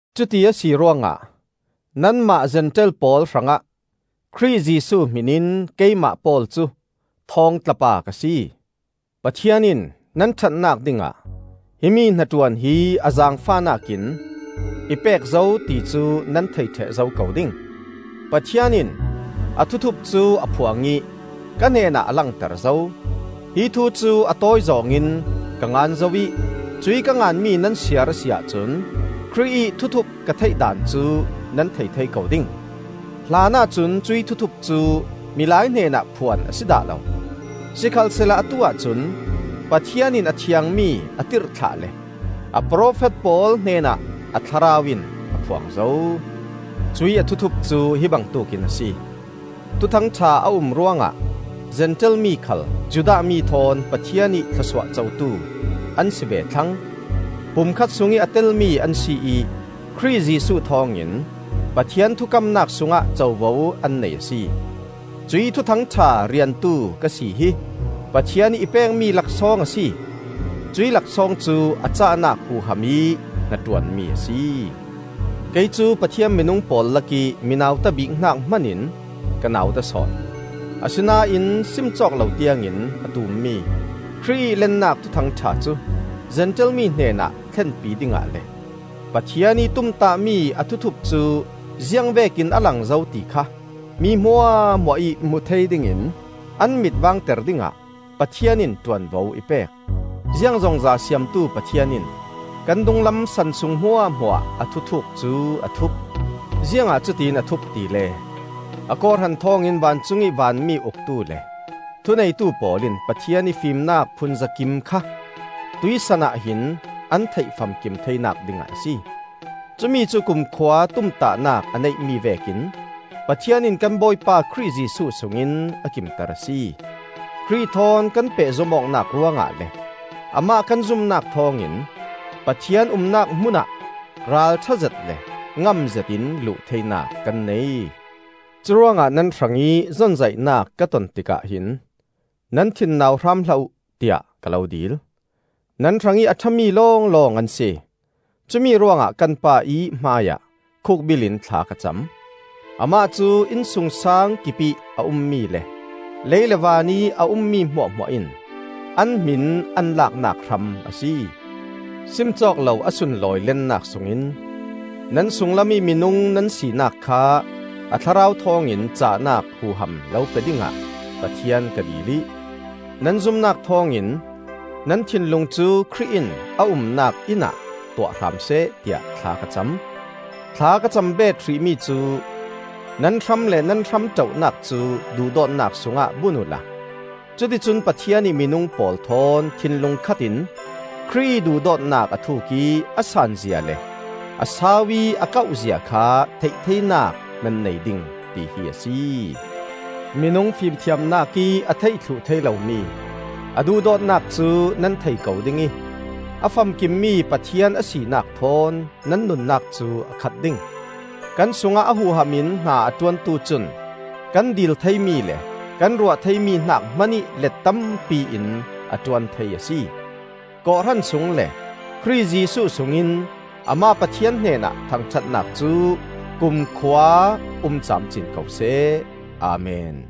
Cuti a si ruangah nanmah Zentail pawl hrangah Khrih Jesuh hmin in keimah Paul cu thawngtlapa ka si. Pathian in nan ṭhatnak dingah himi hnaṭuan hi a zaangfahnak in i pek zo ti cu nan thei ṭheh zo ko ding. Pathian in a thuthup cu a phuang ih ka hnenah a langter zo. Hi thu cu a tawizawng in ka ngan zo ih, cuih ka nganmi nan siar a si ahcun Khrih ih thuthup ka theih daan cu nan thei thei ko ding. Hlanah cun cuih thuthup cu milai hnenah phuan a si dah lo; sikhalsehla atu-ah cun Pathian in a thiangmi a tirhthlah le a profet pawl hnenah a Thlarau in a phuang zo. Cuih a thuthup cu hi bangtuk in a si: Thuthang ṭha a um ruangah Zentail mi khal Judah mi thawn Pathian ih thlawsuah cotu an si ve thlang; pumkhat sungih a telmi an si ih Khrih Jesuh thawngin Pathian thukamnak sungah covo an nei a si. Cuih Thuthang ṭha riantu ka si hi Pathian ih i pekmi laksawng a si. Cuih laksawng cu a cahnak huham ih hnaṭuanmi a si. Kei cu Pathian minung pawl lakih mi nauta bik hnak hmanin ka nauta sawn. Asinain sim cawk lo tiangin a tummi Khrih ih lennak Thuthang ṭha cu Zentail mi hnenah thlenpi dingah le, Pathian ih tumtahmi a thuthup cu ziangvekin a lang zo ti kha mi hmuahhmuah ih hmu thei dingin an mit vaangter dingah Pathian in ṭuanvo i pek. Ziangzongza Siamtu Pathian in kan dunglam san sung hmuahhmuah a thuthuuk cu a thup. Ziangah cutiin a thup tile a kawhhran thawngin vancungih vanmi uktu le thuneitu pawl in Pathian ih fimnak phunzakim kha tuihsan ah hin an theih famkim theinak dingah a si. Cumi cu kumkhua tumtahnak a neihmi vekin Pathian in kan Bawipa Khrih Jesuh sungin a kimter a si. Khrih thawn kan pehzom awknak ruangah le Amah kan zumnak thawngin Pathian umnak hmunah ralṭha zet le ngamzet in luh theinak kan nei. Curuangah nan hrangih zonzaihnak ka ton tikah hin nan thin nau hram hlah uh, tiah ka lo dil; nan hrangih a ṭhami lawnglawng an si. Cumi ruangah kan Pa ih hmaiah khukbil in thla ka cam. Amah cu innsungsaang kipih a ummi le lei le van ih a ummi hmuahhmuah in an hmin an laknak hram a si. Sim cawk lo a sunlawi lennak sungin nan sunglam ih minung nan sinak kha a Thlarau thawngin cahnak huham lo pe dingah Pathian ka dil ih, nan zumnak thawngin nan thinlung cu Khrih in a umnak inn ah tuah hram seh, tiah thla ka cam. Thla ka cam beet hrih mi cu: nan hram le nan hramṭohnak cu duhdawtnak sungah bun uhla, cuticun Pathian ih minung pawl thawn thinlung khatin Khrih ih duhdawtnak a thuk ih a sanzia le, a sau ih a kauhzia kha theih theinak nan nei ding, tihi a si. Minung fimthiamnak ih a theih thluh thei lomi a duhdawtnak cu nan thei ko ding ih a famkimmi Pathian a sinak thawn nan nunnak cu a khat ding. Kan sungah a huham in hna a ṭuantu cun kan dil theimi le kan ruah theimi hnak hmanih let tampi in a ṭuan thei a si. Kawhhran sung le Khrih Jesuh sungin amah Pathian hnenah thangṭhatnak cu kumkhua um camcin ko seh! Amen.